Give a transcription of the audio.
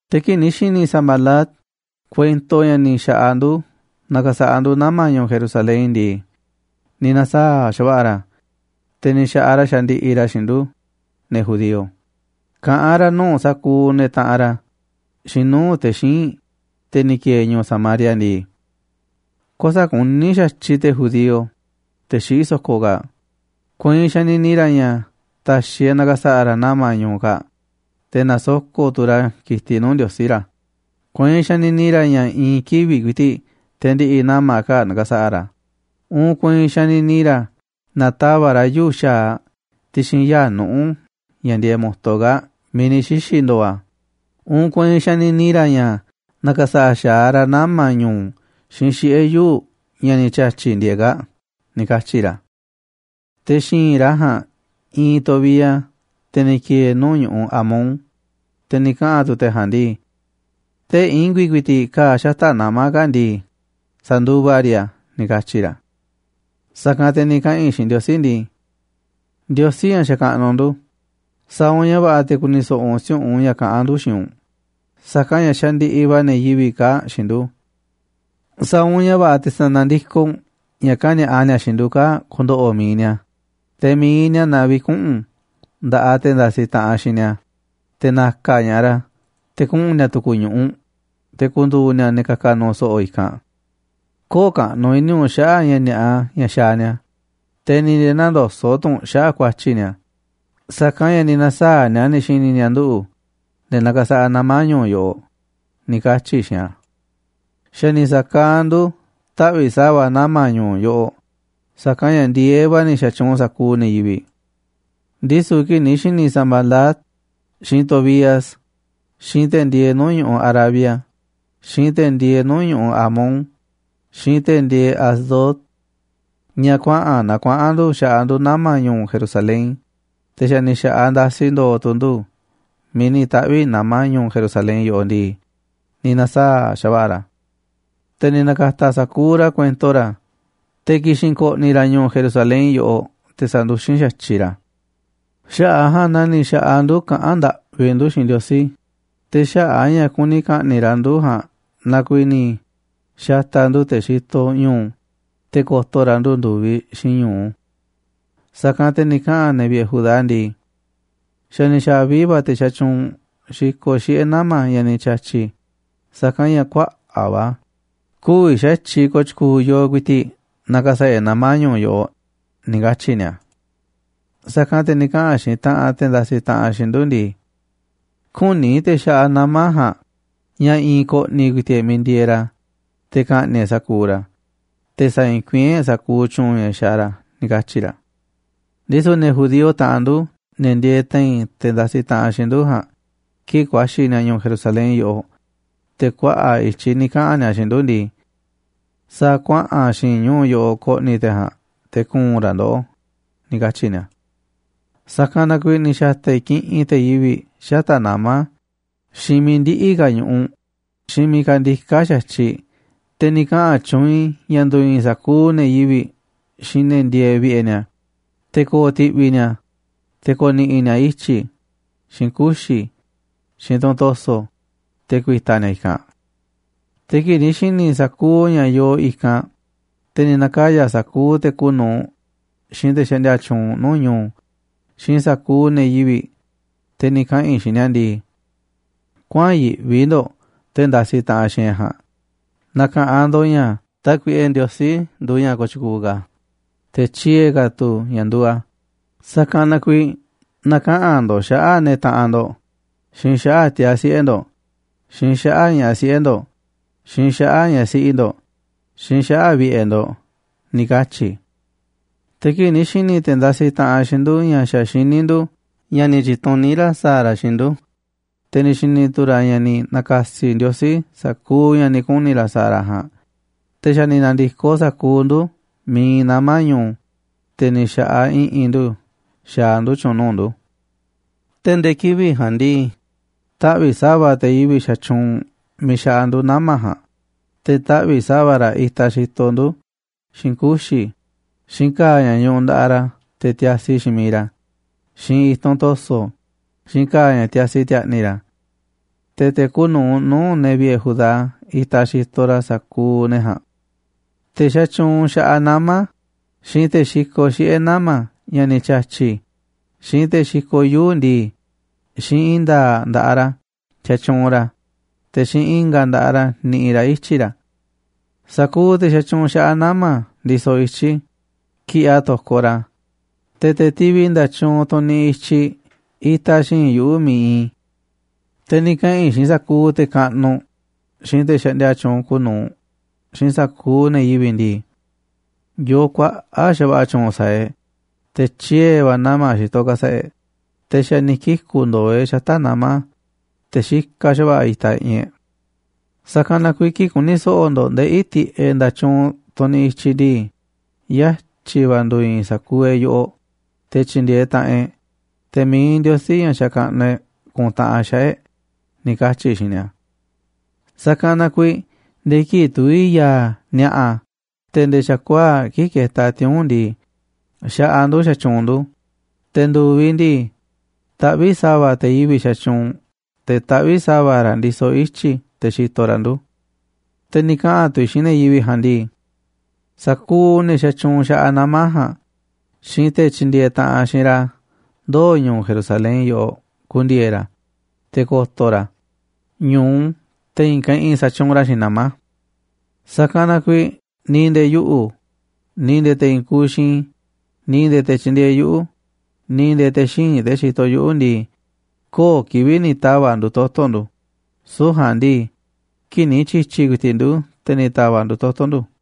Te̱ kii̱ꞌ ni̱ xi̱ni̱ Sanbalat kuento ña̱ ni̱ xa̱ꞌaꞌ ndu̱ nakasaꞌa ndu̱ nama̱ ñu̱u̱ Jerusalén ndii, ni̱ na̱saa̱ꞌ xa̱va̱ꞌa̱ ra̱, te̱ ni̱ xa̱ꞌaꞌ ra̱ xandiꞌiꞌ ra̱ xiinꞌ ndu̱, ne̱ judío, kaꞌán ra̱ nuu̱ꞌ sa̱kuuꞌ ne̱ taꞌanꞌ ra̱ xiinꞌ nuu̱ꞌ te̱ xíinꞌ, te̱ ni̱ ki̱e̱e̱ ñu̱u̱ Samaria ndii: ―Kuäsa̱ꞌ kuní xa̱tyiꞌ te̱ judío, te̱ xiꞌí so̱ko̱ kaa̱ꞌ, kueinꞌ xanini ra̱ ña̱ ta̱xi̱ e̱ꞌ na̱ka̱sa̱ꞌa̱ ra̱ nama̱ ñu̱u̱ kaa̱ꞌ, te̱ na̱soko̱ꞌ tu̱ ra̱ ki̱tiꞌ nuu̱ꞌ Ndiosí ra̱. Kueinꞌ xanini ra̱ ña̱ i̱i̱n kivi̱ꞌ ku̱i̱ti̱ꞌ te̱ ndi̱ꞌi̱ nama̱ kaa̱ꞌ na̱ka̱sa̱ꞌa̱ ra̱, uun kueinꞌ xanini ra̱ na̱tava̱ꞌ ra̱ yuu̱ꞌ xa̱aꞌ ti̱xi̱n yaa̱ꞌ nuꞌu̱ ña̱ ndieeꞌ mo̱to kaa̱ꞌ miiꞌ ni̱ xixi̱ ndo̱o̱ a̱, uun kueinꞌ xanini ra̱ ña̱ na̱ka̱sa̱ꞌa̱ xa̱aꞌ ra̱ nama̱ ñu̱u̱ xiinꞌ xiꞌe̱ yuu̱ꞌ ña̱ ni̱ ti̱a̱tyi̱ ndieeꞌ kaa̱ꞌ ―ni̱ katyi̱ ra̱. Te̱ xi̱i̱nꞌ ra̱ ja̱a̱nꞌ iinꞌ Tobías, te̱ ni̱ ki̱e̱e̱ nuu̱ꞌ ñu̱ꞌuꞌ Amón, te̱ ni̱ kaꞌa̱n tu̱ te̱ ja̱a̱nꞌ ndii: ―Tee̱ꞌ i̱ngu̱i̱ ku̱i̱ti̱ꞌ ka̱a̱ xata̱ꞌ nama̱ kaa̱ꞌ ndii, sa̱nduva riꞌ a̱ ―ni̱ katyi̱ ra̱. Sa̱kanꞌ te̱ ni̱ kaꞌa̱n i̱ xiinꞌ Ndiosí ndii: ―Ndiosí, ña̱ xakaꞌnuꞌ ndu̱, sa̱a̱ u̱nꞌ ña̱ va̱ꞌa̱ te̱ ku̱ni̱ so̱ꞌo̱ u̱nꞌ si̱u̱ꞌunꞌ ña̱ kaꞌán ndu̱ xiinꞌ u̱nꞌ, sa̱kanꞌ ña̱ xandiꞌiꞌ va̱ ne̱ yivi̱ꞌ kaa̱ꞌ xiinꞌ ndu̱. Sa̱a̱ u̱nꞌ ña̱ va̱ꞌa̱ te̱ sa̱na̱ndikoꞌ u̱nꞌ ña̱ kani̱a̱ꞌa ni̱a̱ xiinꞌ ndu̱ kaa̱ꞌ ku̱ndo̱ꞌo̱ mi̱iꞌ ni̱a̱, te̱ mi̱iꞌ ni̱a̱ na vi̱kuꞌu̱n nda̱ꞌaꞌ te̱ ndasiꞌ taꞌanꞌ xiinꞌ ni̱a̱ te̱ na̱ka̱ ña̱ꞌaꞌ ra̱ te̱ kuꞌu̱n ni̱a̱ tu̱ku̱ ñu̱ꞌuꞌ, te̱ ku̱ndu̱u̱ ni̱a̱ ne̱ ka̱ka̱ nu̱u̱ so̱ꞌo̱ i̱kanꞌ. Köo̱ꞌ kaꞌnuꞌ i̱ni̱ u̱nꞌ xaꞌa̱ꞌ ña̱ ni̱a̱ꞌa ña̱ xaaꞌ ni̱a̱, te̱ ni̱ nde̱e̱ nä̱ndoso̱ꞌ tu̱ u̱nꞌ xaꞌa̱ꞌ ku̱a̱tyi̱ ni̱a̱, sa̱kanꞌ ña̱ ni̱ na̱saa̱ꞌ ni̱a̱ ni̱ xi̱ni̱ ni̱a̱ nduꞌu̱, ne̱ nakasaꞌa nama̱ ñu̱u̱ yoꞌoꞌ ―ni̱ katyi̱ i̱ xiinꞌ a̱. Xa̱ ni̱ sa̱kaaꞌ ndu̱ taꞌvi̱ꞌ sa̱va̱ nama̱ ñu̱u̱ yoꞌoꞌ, sa̱kanꞌ ña̱ ndi̱e̱eꞌ va̱ ni̱ xa̱tyuunꞌ sa̱kuuꞌ ne̱ yivi̱ꞌ. Ndisu̱ kii̱ꞌ ni̱ xi̱ni̱ Sanbalat, xiinꞌ Tobías, xiinꞌ te̱ ndieeꞌ nuu̱ꞌ ñu̱ꞌuꞌ Arabia, xiinꞌ te̱ ndieeꞌ nuu̱ꞌ ñu̱ꞌuꞌ Amón, xiinꞌ te̱ ndieeꞌ Asdod ña̱ kuaꞌa̱n naa kuaꞌa̱n ndu̱ xaꞌa ndu̱ nama̱ ñu̱u̱ Jerusalén, te̱ xa̱ ni̱ xa̱ꞌaꞌ ndasi ndo̱o̱ tu̱ ndu̱ miiꞌ ni̱ taꞌvi̱ nama̱ ñu̱u̱ Jerusalen yoꞌoꞌ ndii, ni̱ na̱saa̱ꞌ xa̱va̱ꞌa̱ ra̱. Te̱ ni̱ na̱ka̱ta̱ sa̱kuuꞌ ra̱ kuento ra̱ te̱ ki̱xi̱n ko̱ꞌni̱ ra̱ ñu̱u̱ Jerusalén yoꞌoꞌ, te̱ sa̱nduxín xa̱tyiꞌ ra̱ a̱. Xaꞌa̱ꞌ a̱ ja̱a̱nꞌ na ni̱ xa̱ꞌaꞌ ndu̱ kaꞌán ndaꞌvi ndu̱ xiinꞌ Ndiosí, te̱ xaꞌa̱ꞌ a̱ ña̱ kuni ka̱ꞌni̱ꞌ ra̱ ndu̱ ja̱a̱nꞌ na kuiiꞌ ni̱ xa̱ta̱ ndu̱ te̱ xitoꞌ ñu̱u̱ te̱ ko̱to̱ ra̱ ndu̱ ndu̱viꞌ xiinꞌ ñu̱u. Sa̱kanꞌ te̱ ni̱ kaꞌa̱n ne̱ vi̱ꞌe̱ Judá ndii: ―Xa̱ ni̱ xa̱vi va̱ te̱ xatyuunꞌ xikoꞌ xiꞌe̱ nama̱ ña̱ ni̱ ti̱a̱tyi̱, sa̱kanꞌ ña̱ kuaꞌa̱ꞌ va̱ a̱, kü̱vi̱ xa̱tyiꞌ ko̱o̱ tyu̱ku̱u̱ yooꞌ ku̱i̱ti̱ꞌ na̱ka̱sa̱ꞌa̱ e̱ꞌ nama̱ ñu̱u̱ yoꞌoꞌ ―ni̱ katyi̱ ni̱a̱. Sa̱kanꞌ te̱ ni̱ kaꞌa̱n xiinꞌ taꞌanꞌ te̱ ndasiꞌ taꞌanꞌ xiinꞌ ndu̱ ndii: ―Kü̱ni̱ te̱ xaꞌa nama̱ ja̱a̱nꞌ ña̱ i̱i̱n ko̱ꞌni̱ ku̱i̱ti̱ꞌ e̱ꞌ miiꞌ ndieeꞌ ra̱ te̱ ka̱ꞌni̱ꞌ e̱ꞌ sa̱kuuꞌ ra̱, te̱ sa̱i̱i̱nkuiín e̱ꞌ sa̱kuuꞌ tyu̱u̱n ña̱ xaaꞌ ra̱ ―ni̱ katyi̱ ra̱. Ndisu̱ ne̱ judío, taꞌanꞌ ndu̱, ne̱ ndieeꞌ te̱i̱n te̱ ndasiꞌ taꞌanꞌ xiinꞌ ndu̱ ja̱a̱nꞌ, kii̱ꞌ ku̱a̱xi̱ ni̱a̱ ñu̱u̱ Jerusalén yoꞌoꞌ, te̱ kuaꞌa̱ꞌ i̱tyiꞌ ni̱ kaꞌa̱n ni̱a̱ xiinꞌ ndu̱ ndii: ―Sa̱a̱ kuaꞌa̱n xi̱i̱nꞌ ñu̱u̱ yoꞌoꞌ ko̱ꞌni̱ te̱ ja̱a̱nꞌ te̱ ku̱u̱n ra̱ ndoꞌó ―ni̱ katyi̱ ni̱a̱. Sa̱kanꞌ na kuiiꞌ ni̱ xa̱ta̱ i̱ kiꞌinꞌ te̱ yivi̱ꞌ xata̱ꞌ nama̱, xiinꞌ miiꞌ ndiꞌi̱ ka̱ ñu̱ꞌuꞌ, xiinꞌ miiꞌ kandiká xa̱tyiꞌ, te̱ ni̱ kaꞌa̱n tyuunꞌ i̱ ña̱ ndu̱i̱i̱n sa̱kuuꞌ ne̱ yivi̱ꞌ xiinꞌ ne̱ ndieeꞌ vi̱ꞌe̱ ni̱a̱, te̱ ko̱o̱ ti̱ꞌvi̱ ni̱a̱, te̱ ko̱ni̱ꞌi̱ ni̱a̱ ityi̱ xiinꞌ kuxi̱ xiinꞌ tunꞌ to̱so̱, te̱ ku̱i̱ta̱ ni̱a̱ i̱kanꞌ. Te̱ kii̱ꞌ ni̱ xi̱ni̱ i̱ sa̱kuuꞌ ña̱ yoo i̱kanꞌ, te̱ ni̱ na̱kaya̱ sa̱kuuꞌ te̱ kuuꞌ nu̱uꞌ, xiinꞌ te̱ xaꞌndia tyuunꞌ nuu̱ꞌ ñu̱u̱, xiinꞌ sa̱kuuꞌ ne̱ yivi̱ꞌ, te̱ ni̱ kaꞌa̱n i̱ xiinꞌ ni̱a̱ ndii: ―Kuäa̱nꞌ yiꞌvi ndo̱ꞌ te̱ ndasiꞌ taꞌanꞌ xiinꞌ e̱ꞌ ja̱a̱nꞌ. Na̱ka̱ꞌanꞌ ndo̱ꞌ ña̱ Tákuiꞌe Ndiosí nduuꞌ ña̱ kooꞌ tyukuuꞌ ka̱, te̱ tyiee̱ ka̱ tu̱ ña̱ nduuꞌ a̱, sa̱kanꞌ na kuiiꞌ na̱kaꞌa̱n ndo̱ꞌ xaꞌa̱ꞌ ne̱ taꞌanꞌ ndo̱ꞌ, xiinꞌ xaꞌa̱ꞌ tiaa̱ siꞌe̱ ndo̱ꞌ, xiinꞌ xaꞌa̱ꞌ ña̱ꞌaꞌ siꞌe̱ ndo̱ꞌ, xiinꞌ xaꞌa̱ꞌ ñaꞌ siꞌi ndo̱ꞌ, xiinꞌ xaꞌa̱ꞌ vi̱ꞌe̱ ndo̱ꞌ ―ni̱ katyi̱ i̱. Te̱ kii̱ꞌ ni̱ xi̱ni̱ te̱ ndasiꞌ taꞌanꞌ xiinꞌ ndu̱ ña̱ xa̱ xiní ndu̱ ña̱ ni̱ tyi̱tuní ra̱ sa̱a̱ ra̱ xiinꞌ ndu̱, te̱ ni̱ xi̱ni̱ tu̱ ra̱ ña̱ ni̱ na̱ka̱si̱ Ndiosí sa̱kuuꞌ ña̱ ni̱ kuni̱ ra̱ sa̱a̱ ra̱ ja̱a̱nꞌ, te̱ xa̱ ni̱ na̱ndi̱koꞌ sa̱kuuꞌ ndu̱ miiꞌ iinꞌ nama̱ ñu̱u̱, te̱ ni̱ xa̱ꞌaꞌ i̱ꞌi̱n ndu̱ xaaꞌ ndu̱ tyu̱u̱n nuu̱ꞌ ndu̱. Te̱ nde̱e̱ kivi̱ꞌ ja̱a̱nꞌ ndii, taꞌvi̱ꞌ sa̱va̱ te̱ yivi̱ꞌ xatyuunꞌ miiꞌ xaꞌa ndu̱ nama̱ ja̱a̱nꞌ, te̱ taꞌvi̱ꞌ sa̱va̱ ra̱ itaꞌ xitoꞌ ndu̱ xiinꞌ kuxi̱, xiinꞌ ka̱a̱ ña̱ ñuꞌuꞌ nda̱ꞌaꞌ ra̱ te̱ tiasi xiinꞌ mi̱iꞌ ra̱, xiinꞌ i̱tunꞌ to̱so̱, xiinꞌ ka̱a̱ ña̱ tiasi ti̱a̱ꞌni̱ ra̱. Te̱ te̱ kuuꞌ nu̱uꞌ nuu̱ꞌ ne̱ vi̱ꞌe̱ Judá itaꞌ xitoꞌ ra̱ sa̱kuuꞌ ne̱ ja̱a̱nꞌ. Te̱ xatyuunꞌ xaꞌa nama̱, xiinꞌ te̱ xikoꞌ xiꞌe̱ nama̱ ña̱ ni̱ ti̱a̱tyi̱, xiinꞌ te̱ xikoꞌ yuu̱ꞌ ndii, xiinꞌ i̱i̱n nda̱a̱ꞌ nda̱ꞌaꞌ ra̱ xatyuunꞌ ra̱, te̱ xiinꞌ i̱nga̱ nda̱ꞌaꞌ ra̱ niꞌiꞌ ra̱ ityi̱ ra̱. Sa̱kuuꞌ te̱ xatyuunꞌ xaꞌa nama̱ ndisoꞌ ityi̱, kiꞌiꞌ a̱ to̱koꞌ ra̱, te̱, te̱ tivi nda̱tyuunꞌ tunꞌ niꞌiꞌ i̱tyiꞌ itaꞌ xi̱i̱nꞌ yuꞌu̱ miiꞌ iinꞌ i̱. Te̱ ni̱ kaꞌa̱n i̱ xiinꞌ sa̱kuuꞌ te̱ kaꞌnuꞌ, xiinꞌ te̱ xaꞌndia tyuunꞌ kuuꞌ nu̱uꞌ, xiinꞌ sa̱kuuꞌ ne̱ yivi̱ꞌ ndii: ―Yoo kuaꞌa̱ꞌ xa̱va̱ꞌa̱ tyu̱u̱n sa̱a̱ e̱ꞌ, te̱ tyiee̱ va̱ nama̱ xitoꞌ ka̱sa̱ꞌa̱ e̱ꞌ, te̱ xa̱ ni̱ kiku̱ ndo̱o̱ e̱ꞌ xata̱ꞌ nama̱, te̱ xikaꞌ xa̱va̱ꞌa̱ itaꞌ i̱ꞌi̱n e̱ꞌ. Sa̱kanꞌ na kuiiꞌ kii̱ꞌ ku̱ni̱ so̱ꞌo̱ ndo̱ꞌ ndeꞌí tiꞌeꞌ nda̱tyuunꞌ, tunꞌ niꞌiꞌ i̱tyiꞌ ndii, yatyi̱ va̱ ndu̱i̱i̱n sa̱kuuꞌ e̱ꞌ yoꞌoꞌ te̱ tyi̱ndi̱e̱eꞌ taꞌanꞌ e̱ꞌ, te̱ mi̱iꞌ Ndiosí, ña̱ xakaꞌnuꞌ e̱ꞌ, ku̱ntaꞌanꞌ xaꞌa̱ꞌ e̱ꞌ ―ni̱ katyi̱ i̱ xiinꞌ ni̱a̱. Sa̱kanꞌ na kuiiꞌ nde̱e̱ kii̱ꞌ tuví ya̱a̱ ni̱a̱ꞌa̱ te̱ nde̱e̱ xa̱kuaa̱ꞌ kii̱ꞌ ketaꞌ tiuu̱nꞌ ndii, xaꞌaꞌ ndu̱ xatyuunꞌ ndu̱, te̱ ndu̱viꞌ ndii, taꞌvíꞌ sa̱va̱ te̱ yivi̱ꞌ xatyuunꞌ te̱ taꞌvíꞌ sa̱va̱ ra̱ ndisoꞌ ityi̱ te̱ xitoꞌ ra̱ ndu̱. Te̱ ni̱ kaꞌa̱n tu̱ i̱ xiinꞌ ne̱ yivi̱ꞌ ja̱a̱nꞌ ndii: ―Sa̱kuuꞌ ne̱ xatyuunꞌ xaꞌa nama̱ ja̱a̱nꞌ, xiinꞌ te̱ tyindieeꞌ taꞌanꞌ xiinꞌ ra̱ ndoo̱ ñu̱u̱ Jerusalén yóꞌo ku̱ndi̱e̱e̱ ra̱, te̱ ko̱to̱ ra̱ a̱ ñu̱u te̱ i̱i̱n keꞌinꞌ sa̱tyuunꞌ ra̱ xiinꞌ nama̱. Sa̱kanꞌ na kuiiꞌ ni̱ nde̱e̱ yuꞌu̱, ni̱ nde̱e̱ te̱ i̱i̱n kuuꞌ xiinꞌ i̱, ni̱ nde̱e̱ te̱ tyindieeꞌ yuꞌu̱, ni̱ nde̱e̱ te̱ xíinꞌ, te̱ xitoꞌ yuꞌu̱ ndii, köo̱ꞌ kivi̱ꞌ ni̱ ta̱va̱ꞌ ndu̱ toto̱ ndu̱, süu̱ꞌ ja̱a̱nꞌ ndii, kii̱ꞌ ni̱ tyi̱tyi̱ ku̱i̱ti̱ꞌ ndu̱, te̱ ni̱ ta̱va̱ꞌ ndu̱ toto̱ ndu̱.